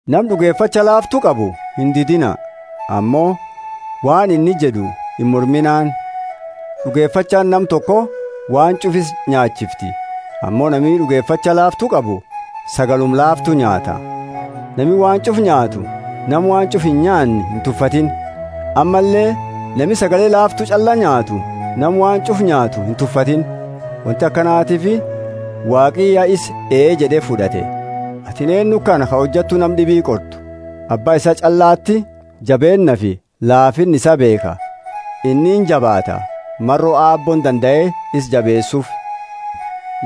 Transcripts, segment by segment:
Nama d'ugefacha laaftu qabu indidiina, ammo waan inni jed'u imorminaani. D'ugefachaani nama toko waan ch'ufa isa inyaachifti ammo nami d'ugefacha laaftu qabu sagaluma laaftu nyaata. Nami waan ch'ufa nyaatu nama waan ch'ufa inyaanne intufatiini; ammalle nami sagale laaftu ch'alla nyaatu nama waan ch'ufa nyaatu intufatiini; wonti akanatiifi Waaqi ya isa ee jed'e fud'ate. Atini eennu kana ka hojattu nama d'ibi qortu? Abba isaa ch'allati jabeennaafi laafinna isaa beekha. Inni injabaata, maro Aabbooni dandae isa jabeesuufi.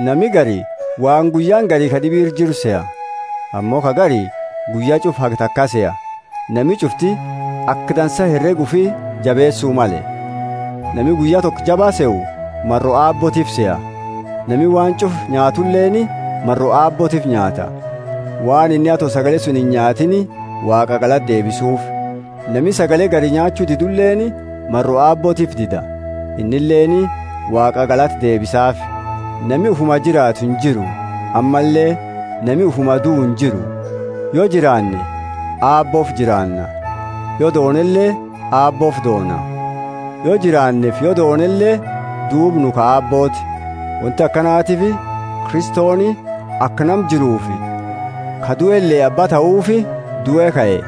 Nami gari waan guyyaani gari ka d'ibi ira jiru seha, ammo ka gari guyya ch'ufa haga taka seha. Nami ch'ufti aka dansa herega ufi jabeesu male. Nami guyya toko jaba sehu maro Aabbootiifi seha; nami waan ch'ufa nyaatuleeni maro Aabbootiifi nyaata, waan inni ato sagale suni inyaatini Waaqa galata deebisuufi. Nami sagale gari nyaachu diduleeni maro Aabbootiifi dida, innileeni Waaqa galata deebisaafi. Nami ufuma jiraatu injiru, ammalle nami ufuma duu injiru; yo jiraanne Aabboofi jiraanna, yo doonele, Aabboofi doona. Yo jiraanneefi yo doonele duuba nu ka Aabbooti. Wonti akanatiifi Kristoni aka nama jiruufi ka duele abba tahuufi due kae.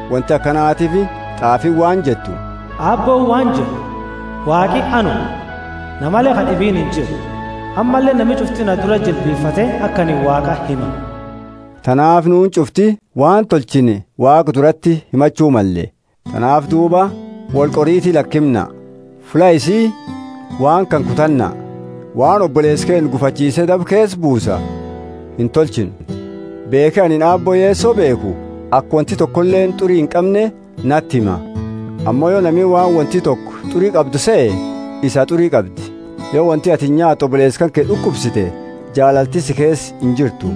Wonti akanatiifi t'aafiini waan jettu, Aabbooni waan jed'u, Waaqi anuma, namale ka d'ibiini injiru, ammalle nami ch'ufti na durati jilbifate aka anini Waaqa hima. Tanaafi nuuni ch'ufti waan tolchine Waaqa durati himachu malle. Tanaafi duuba, woli qoriiti lakimna. Fulla isii waan kana kutannaa: waan oboleesa keenna gufachiise daba keesa buusa intolchinu. Beekhi anini Aabbo Yeso beekhu aka wonti tokoleeni t'uri inqamne nati hima; ammo yo nami waan wonti toko t'uri qabdu sehe, isaa t'uri qabdi. Yo wonti atini nyaatuu oboleesa kanke d'ukubsite, jaalalti si keesa injirtu.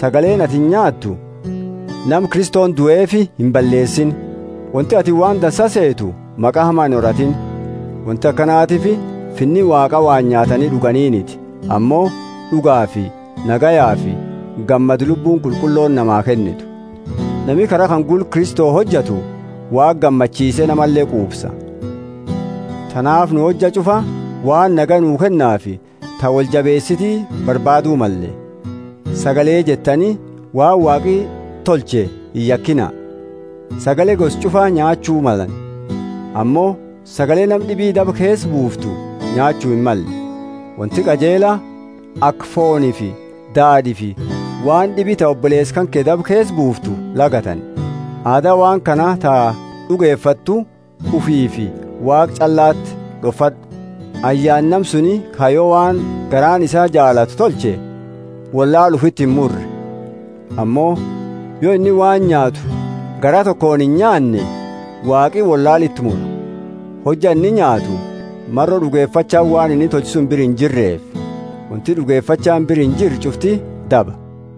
Sagaleeni atini nyaattu nama Kristoni duefi imballeesini! Wonti atini waan dansa seetu maqa hama inhoratiini. Wonti akanatiifi Finni Waaqa waan nyaatani d'uganiiniti, ammo d'ugaafi nagayafi gammada Lubbuuni Qulqullooni namaa kennitu. Nami kara kana gula Kristo hojatu Waaqa gammachiise namale quufsa. Tanaafi nu hojja ch'ufa waan nagaya nu kennaafi ta woli jabeesiti barbaadu malle. Sagalee jettani waan Waaqi tolche iyakina. Sagale gosa ch'ufa nyaachu malani, ammo sagale nama d'ibi daba keesa buuftu nyaachu himmalle. Wonti qajeela aka foonifi daad'iifi waan d'ibi ta oboleesa kanke daba keesa buuftu lagatani. Aada waan kana ta d'ugefattu ufiifi Waaqa ch'allati d'ofad'u. Ayyaana nama suni ka yo waan garaani isaa jaalatu tolche wollaala ufiiti imurre! Ammo yo inni waan nyaatu garaa tokooni inyaanne, Waaqi wollaala iti mura, hojja inni nyaatu, maro d'ugefachaani waan inni tolche suni bira injirreefi. Wonti d'ugefachaani bira injirre ch'ufti daba.